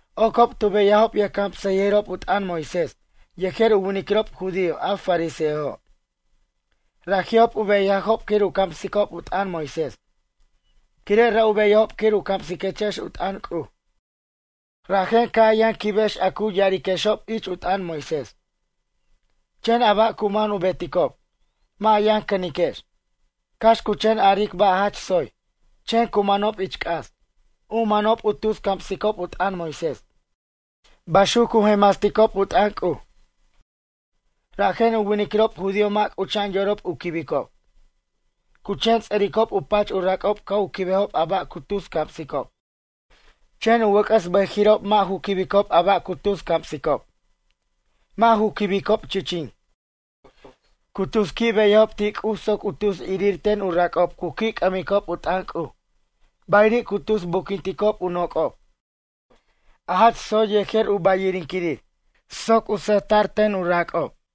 ―Ocob tu beyajob yʌjcamsʌyʌjirob u t'ʌn Moisés yejer u winiquirob judío a fariseojo'. Raji'ob u beyajob quir u camsicob u t'ʌn Moisés. Quire' ra' u beyajob quir u camsiquechex u t'ʌn C'uj, rajen ca' a yʌn quibex a cu ya'ariquexob ich u t'ʌn Moisés. Chen a ba' cu man u beticob, mʌ' a yʌn cʌniquex. Cax cu chen aric ba' jach tsoy, chen cu manob ich c'as. U manob u tus camsicob u t'ʌn Moisés, baxuc cu jenmasticob u t'ʌn C'uj. Rajen u winiquirob judío mʌ' c'ucha'an yorob u quibicob. Cu chen ts'ʌricob u pach u rac'ob ca' u quibejob a ba' cu tus camsicob. Chen u wʌc'ʌs bʌjiri'ob mʌ' ju quibicob a ba' cu tus camsicob, mʌ' ju quibicob chichin. Cu tus qui' beyajob ti' C'uj soc u tus irir ten u rac'ob cu qui' c'ʌmicob u t'ʌn C'uj. Bayiri' cu tus buquinticob u noc'ob, a jach tsoy yejer u ba'yinquirir, soc sʌjta'r ten u rac'ob.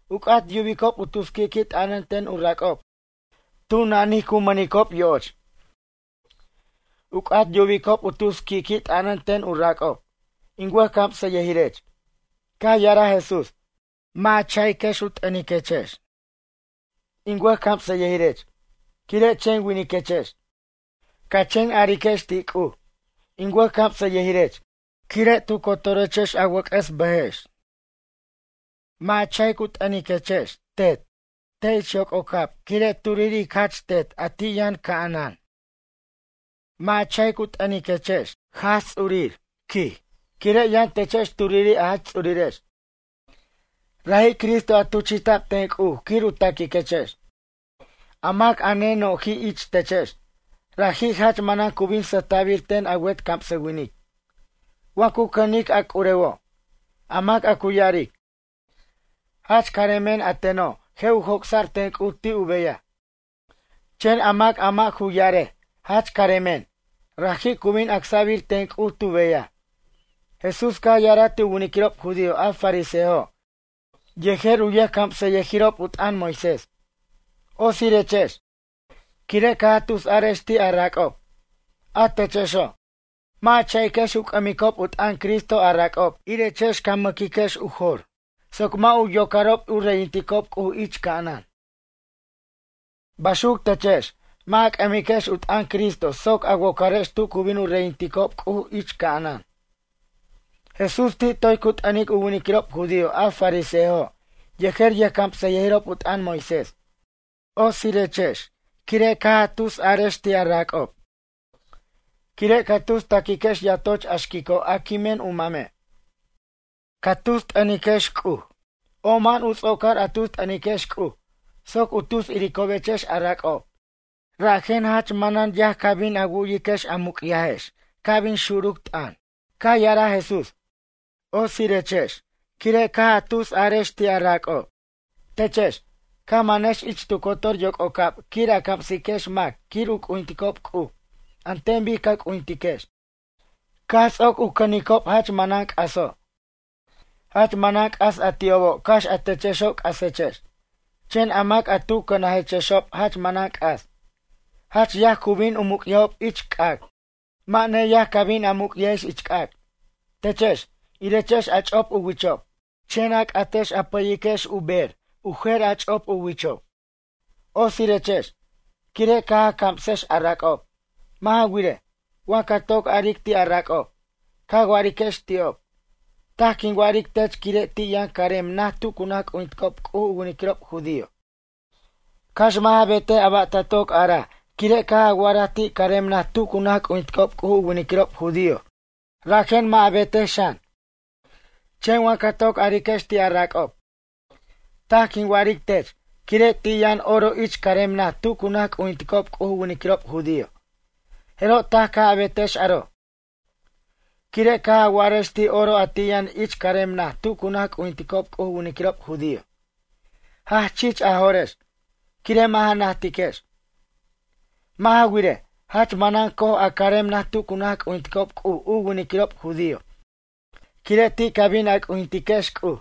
’U c'at yubicob u tus qui'qui' t'ʌnʌn ten u rac'ob tu nanij cu mʌnicob yo'och. U c'at yubicob u tus qui'qui' t'ʌnʌn ten u rac'ob: “In wʌjcamsʌyʌjirech.” Caj ya'araj Jesús: ―Mʌ' a cha'iquex u t'ʌniquex: “In wʌjcamsʌyʌjirech” quire' chen winiquechex. Ca chen ariquex ti' C'uj: “In wʌjcamsʌyʌjirech” quire' tu cotorechex a wʌc'ʌs bʌjex. Mʌ' a cha'ic u t'ʌniquex: “Tet” te' ich yoc'ocab quire' turiri' ic Jach Tet a ti' yʌno' ca'anan. Mʌ' a cha'ic u t'ʌniquex: “Jaj Ts'urir” ―quij―, quire' yʌn techex turiri' a Jach Ts'urirex, raji' Cristo a tuchi'ta'b ten C'uj quir u taquiquechex. A mac a neno'ji' ich techex, raji' jach manan cu bin sʌjta'bir ten a wet camsawinic, wa cu cʌnic a c'urewo'. A mac a cu ya'aric: “Jach caremen a teno'” je' u joc'sa'r ten C'uj ti' u beyaj. Chen a mac a mʌ' ju ya'arej: “Jach caremen” raji' cu bin acsa'bir ten C'uj tu beyaj. Jesús caj ya'araj ti' u winiquirob judío a fariseojo' yejer u yʌjcamsʌyʌjirob u t'ʌn Moisés: ―Otsirechex, quire' caj a tusarex ti' a rac'ob. A techexo', mʌ' a cha'iquex u c'ʌmicob u t'ʌn Cristo a rac'ob irechex ca maquiquex u jor soc mʌ' u yocarob u reyinticob C'uj ich ca'anan. Baxuc techex, mʌ' a c'ʌmiquex u t'ʌn Cristo soc a wocarex tu cu bin u reyinticob C'uj ich ca'anan. Jesús ti' toy cu t'ʌnic u winiquirob judío a fariseojo' yejer yʌjcamsʌyʌjirob u t'ʌn Moisés: ―Otsirechex, quire' caj a tusarex ti' a rac'ob. Quire' ca tus taquiquex yatoch a xquico' a quimen u mame'. Caj a tus t'ʌniquex C'uj, oma'an u ts'ocar a tus t'ʌniquex C'uj soc u tus iricobechex a rac'ob. Rajen jach manan yaj ca bin a wu'yiquex a muc'yajex ca' bin xuruc t'ʌn. Caj ya'araj Jesús: ―Otsirechex, quire' caj a tusariquex ti' a rac'ob. Techex, ca manex ich tu cotor yoc'ocab quir a camsiquex mac quir u c'ujinticob C'uj an ten bic ca c'ujintiquex. Caj ts'oc u cʌnicob jach manan c'aso'. Jach manan c'as a ti'obo' cax a techexo' c'asechex, chen a mac a tu cʌnajechexob jach manan c'as. Jach yaj cu bin u muc'ajob ich c'ac', mʌ' neyaj ca bin a muc'yajex ich c'ac'. ’Techex, irechex a ch'op u wichob, chen a c'atex a pʌyiquex u bej u jer ch'op u wichob. Otsirechex, quire' caj a camsex a rac'ob. Mʌ' ja wirej, wa ca toc aric ti' a rac'ob, ca wa'ariquex ti'ob: “Taj quin wa'aric tech quire' ti' yʌn carem naj tu cu naj c'ujinticob C'uj u winiquirob judío.” Cax mʌ' ja betej a ba' ta toc a'araj quire' caj a wa'araj ti' carem naj tu cu naj c'ujinticob C'uj u winiquirob judío rajen mʌ' a betej xan. Chen wa ca toc ariquex ti' a rac'ob: “Taj quin wa'aric tech quire' ti' yʌn oro ich carem naj tu cu naj c'ujinticob C'uj u winiquirob judío.” Jeroj taj ca' a betex aro', quire' caj a wa'arex ti' oro a ti' yʌn ich carem naj tu cu naj c'ujinticob C'uj u winiquirob judío. Jach chich a jo'rex, quire' mʌ' ja najtiquex. Mʌ' ja wirej, jach manan co'oj a carem naj tu cu naj c'ujinticob C'uj u winiquirob judío quire' ti' ca bin a c'ujintiquex C'uj.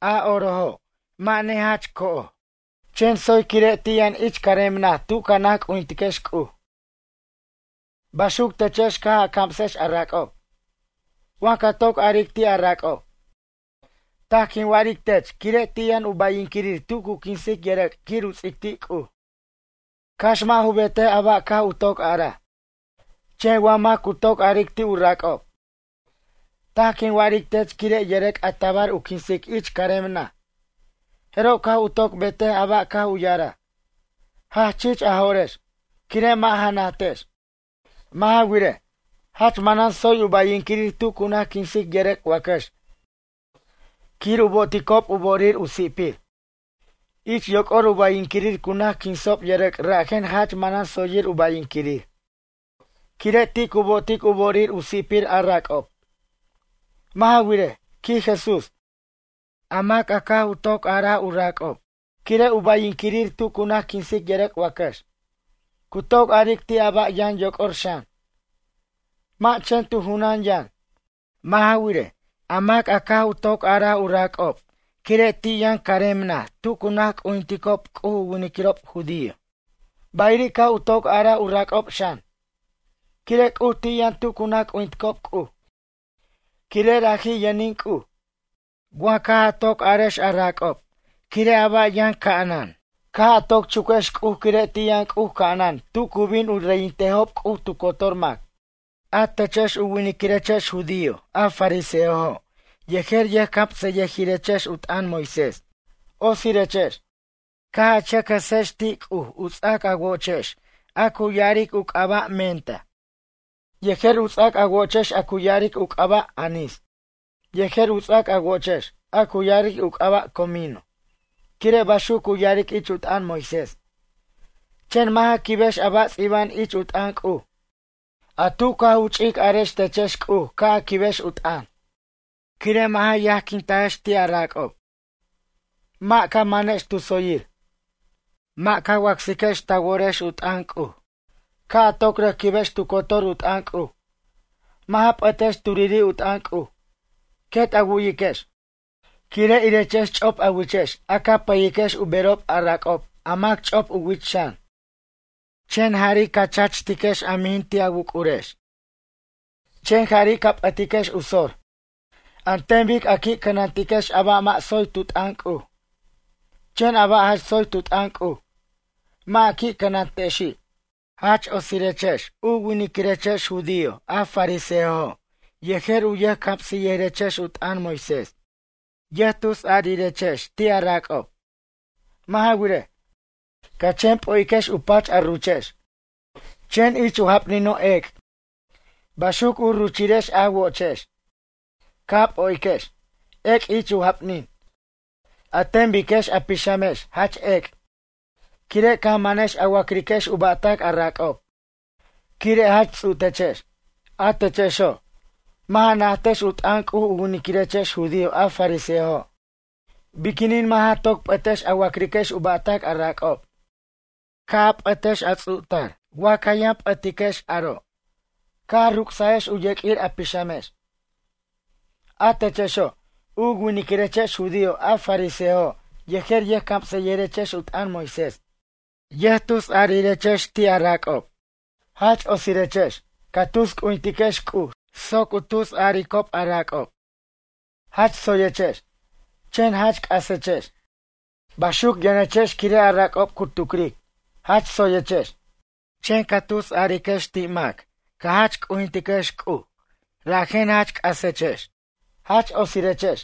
A orojo' mʌ' nejach co'oj, chen tsoy quire' ti' yʌn ich carem naj tu ca naj c'ujintiquex C'uj. Baxuc techex caj a camsex a rac'ob: Wa ca toc aric ti' a rac'ob: “Taj quin wa'aric tech quire' ti' yʌn u ba'yinquirir tu cu quinsic yʌrʌc' quir u ts'ic ti' C'uj.” Cax mʌ' ju betej a ba' caj u toc araj. Chen wa mac cu toc aric ti' u rac'ob: “Taj quin wa'aric tech quire' yʌrʌc' a tabar u quinsic ich carem naj. Jeroj ca' u toc betej a ba' caj u ya'araj.” Jach chich a jo'rex, quire' mʌ' ja najtex. Mʌ' ja wirej, jach manan tsoy u ba'yinquirir tu cu naj quinsic yʌrʌc' wacax quir u bo'oticob u bo'orir u si'pir. Ich yoc'or u ba'yinquirir cu naj quinsob yʌrʌc' rajen jach manan tsoyir u ba'yinquirir, quire' ti' cu bo'otic u bo'orir u si'pir a rac'ob. Mʌ' ja wirej ―quij Jesús―. A mac a caj u toc arar u rac'ob quire' u ba'yinquirir tu cu naj quinsic yʌrʌc' wacax. Cu toc aric ti' a ba' yʌn yoc'or xan, mʌ' chen tu junan yʌn. Mʌ' ja wirej, a mac a caj u toc arar u rac'ob quire' ti' yʌn carem naj tu cu naj c'ujinticob C'uj u winiquirob judío. Bayiri' caj u toc araj u rac'ob xan, quire' C'uj ti' yʌn tu cu naj c'ujinticob C'uj, quire' raji' yʌnin C'uj. Wa caj a toc arex a rac'ob quire' a ba' yʌn ca'anan, caj a toc chuquex C'uj quire' ti' yʌn C'uj ca'anan tu cu bin u reyintejob C'uj tu cotor mac. ’A techex u winiquirechex judío a fariseojo' yejer yʌjcamsʌyʌjirex u t'ʌn Moisés. Otsirechex, caj a chʌc jʌsex ti' C'uj u ts'ac a wo'ochex a cu ya'aric u c'aba' mienta, yejer u ts'ac a wo'ochex cu ya'aric u c'aba' anis. Yejer u ts'ac a wo'ochex, a cu ya'aric u c'aba' comino, quire' baxuc cu ya'aric ich u t'ʌn Moisés. Chen mʌ' ja quibex a ba' ts'iba'an ich u t'ʌn C'uj, a tu caj u ch'ic arex techex C'uj ca' a quibex u t'ʌn. Quire' mʌ' ja yajquintaex ti' a rac'ob. Mʌ' ca manex tu tsoyir. Mʌ' ca wacsiquex ta worex u t'ʌn C'uj. Ca' a toc rʌc quibex tu cotor u t'ʌn C'uj. Mʌ' ja p'ʌtex turiri' u t'ʌn C'uj. Quet a wu'yiquex. Quire' irechex ch'op a wichex a ca pʌyiquex u berob a rac'ob a mac ch'op u wich xan. Chen jari' ca chachtiquex a mijin ti' a wuc'urex. Chen jari' ca p'ʌtiquex u sor, an ten bic a qui' cʌnantiquex a ba' mʌ' tsoy tu t'ʌn C'uj. Chen a ba' jach tsoy tu t'ʌn C'uj, mʌ' a qui' cʌnantexi'. ’Jach otsirechex, u winiquirechex judío a fariseojo' yejer u yʌjcamsʌyʌjirechex u t'ʌn Moisés. Yʌjtusariquechex ti' a rac'ob. Mʌ' ja wirej, ca chen p'o'iquex u pach a ruchex, chen ich u japnino' ec'. Baxuc u ruchirex a wo'ochex, ca p'o'iquex, ec' ich u japnin. An ten biquex a pixamex jach ec' quire' caj manex a wa'criquex u ba'tac a rac'ob, quire' jach ts'u' techex. A techexo', mʌ' ja najtex u t'ʌn C'uj u winiquirechex judío a fariseojo'. Biquinin mʌ' ja toc p'ʌtex a wac'riquex u ba'tac a rac'ob. Ca' a p'ʌtex a ts'u'tar. Wa ca yʌn p'ʌtiquex aro', caj a ruc'sajex u yeq'uir a pixamex. ’A techexo', u winiquirechex judío a fariseojo' yejer yʌjcamsʌyirechex u t'ʌn Moisés. Yʌjtusarirex ti' a rac'ob. Jach otsirechex, ca tus c'ujintiquex C'uj soc u tusaricob a rac'ob: “Jach tsoyechex”, chen jach c'asechex. Baxuc yʌnechex quire' a rac'ob cu tucric: “Jach tsoyechex.” Chen ca tusariquex ti' mac ca jach c'ujintiquex C'uj, rajen jach c'asechex. ’Jach otsirechex,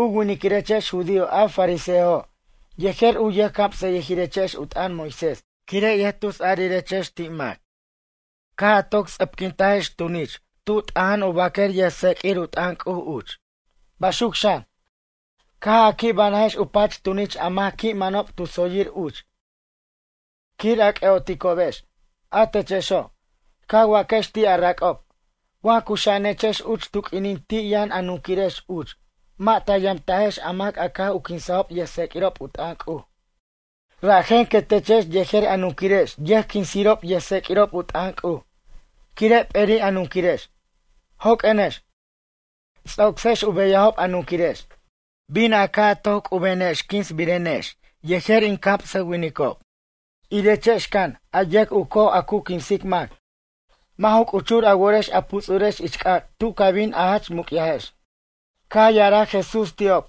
u winiquirechex judío a fariseojo' yejer u yʌjcamsʌyʌirechex u t'ʌn Moisés quire' yʌjtusarirechex ti' mac. Caj a toc ts'ʌpquintajex tunich tu t'oja'an u baquer yʌjtseq'uir u t'ʌn C'uj uch. Baxuc xan, caj a qui' banajex u pach tunich a mac qui' manob tu tsoyir uch, quir a c'ʌ'oticobex. A techexo', ca waquex ti' a rac'ob: “Wa cuxa'anechex uch tu q'uinin ti' yʌn a nunquirex uch mʌ' ta yamtajex a mac a caj u quinsajob yʌjtseq'uirob u t'ʌn C'uj.” Rajen quetechex yejer a nunquirex yʌjquinsirob yʌjtseq'uirob u t'ʌn C'uj, quire' p'eri' a nunquirex. Joq'uenex, ts'ocsex u beyajob a nunquirex. Bin a caj toc c'ubenex quinsbirenex yejer in camsʌwinicob. ’Irechex can, a yʌc u coj a cu quinsic mac. Mʌ' ju c'uchur a worex a puts'urex ich c'ac' tu ca bin a jach muc'yajex. Caj ya'araj Jesús ti'ob: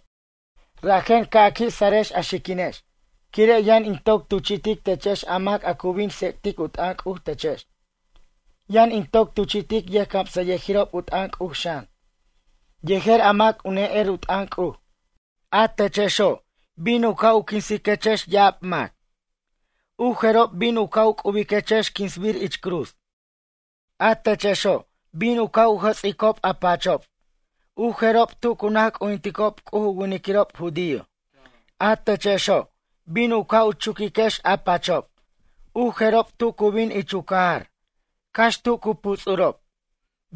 ―Rajen ca' a qui' sarex a xiquinex, quire' yʌn in toc tuchi'tic techex a mac a cu bin tsec'tic u t'ʌn C'uj techex. Yʌn in toc tuchi'tic yʌjcamsʌyʌjirob u t'ʌn C'uj xan, yejer a mac u ne'er u t'ʌn C'uj. A techexo', bin a caj quinsiquex ya'ab mac. U jerob bin a caj c'ubiquex quinsbir ich cruz. A techexo', bin a caj jʌts'iquex u pachob u jerob tu cu naj c'ujinticob C'uj u winiquirob judío. A techexo', bin a caj chuquiquex u pachob u jerob tu cu bin ich u cajar, cax tu cu puts'urob,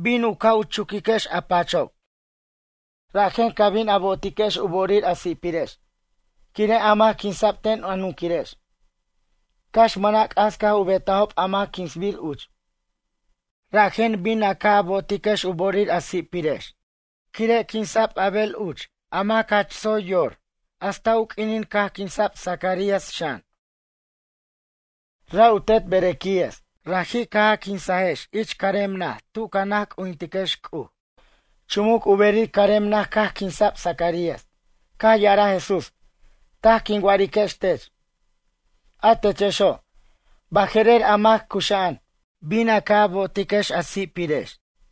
bin a caj chuquiquex u pachob. Rajen ca bin a bo'otiquex u bo'orir a si'pirex, quire' a mac quinsa'b ten a nunquirex, cax mʌna' c'as caj u betajob a mac quinsbir uch. Rajen bin a caj bo'otiquex u bo'orir a si'pirex, quire' quinsa'b Abel uch a mac jach tsoyir yor hasta u q'uinin caj quinsa'b Zacarías xan. Ra' u tet Berequías. Raji' caj a quinsajex ich carem naj tu ca naj c'ujintiquex C'uj. Chumuc u berir carem naj caj quinsa'b Zacarías. Caj ya'araj Jesús: ―Taj quin wa'ariquex tech. A techexo', baje'rer a mac cuxa'an, bin a caj bo'otiquex a si'pirex.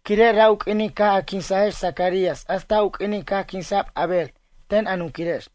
Quire' ra' u q'uinin caj a quinsajex Zacarías hasta u q'uinin caj quinsa'b Abel ten a nunquirex.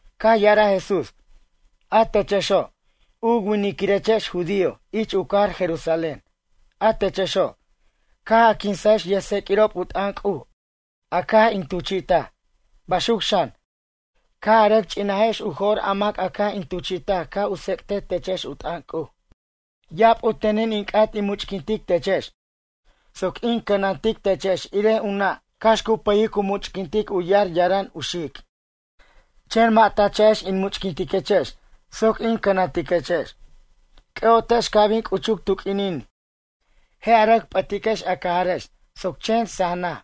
Caj ya'araj Jesús: ―A techexo', u winiquirechex judío ich u cajar Jerusalén. A techexo', caj a quinsajex yʌjtseq'uirob u t'ʌn C'uj a caj in tuchi'taj. Baxuc xan, caj a rʌc ch'inajex u jo'r a mac caj in tuchi'taj ca' u tsec'tej techex u t'ʌn C'uj. Ya'ab u tenin in c'at in much'quintic techex soc in cʌnantic techex irej u nʌ' cax cu pʌyic cu much'quintic u yar yarʌn u xic'. Chen mʌ' ta cha'ex in much'quintiquechex soc in cʌnantiquechex. C'ʌ'otex ca' bin c'uchuc tu q'uinin, je' a rʌc p'ʌtiquex a cajarex soc chen saj naj,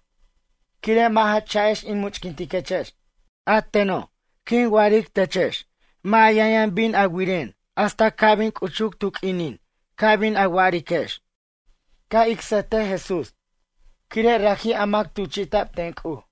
quire' mʌ' ja cha'ex in much'quintiquechex. A teno', quin wa'aric techex, mʌ' a yʌn yʌn bin a wiren hasta ca' bin c'uchuc tu q'uinin ca bin a wa'ariquex: “Ca' ic sʌjtej Jesús, quire' raji' a mac tuchi'tac ten C'uj.”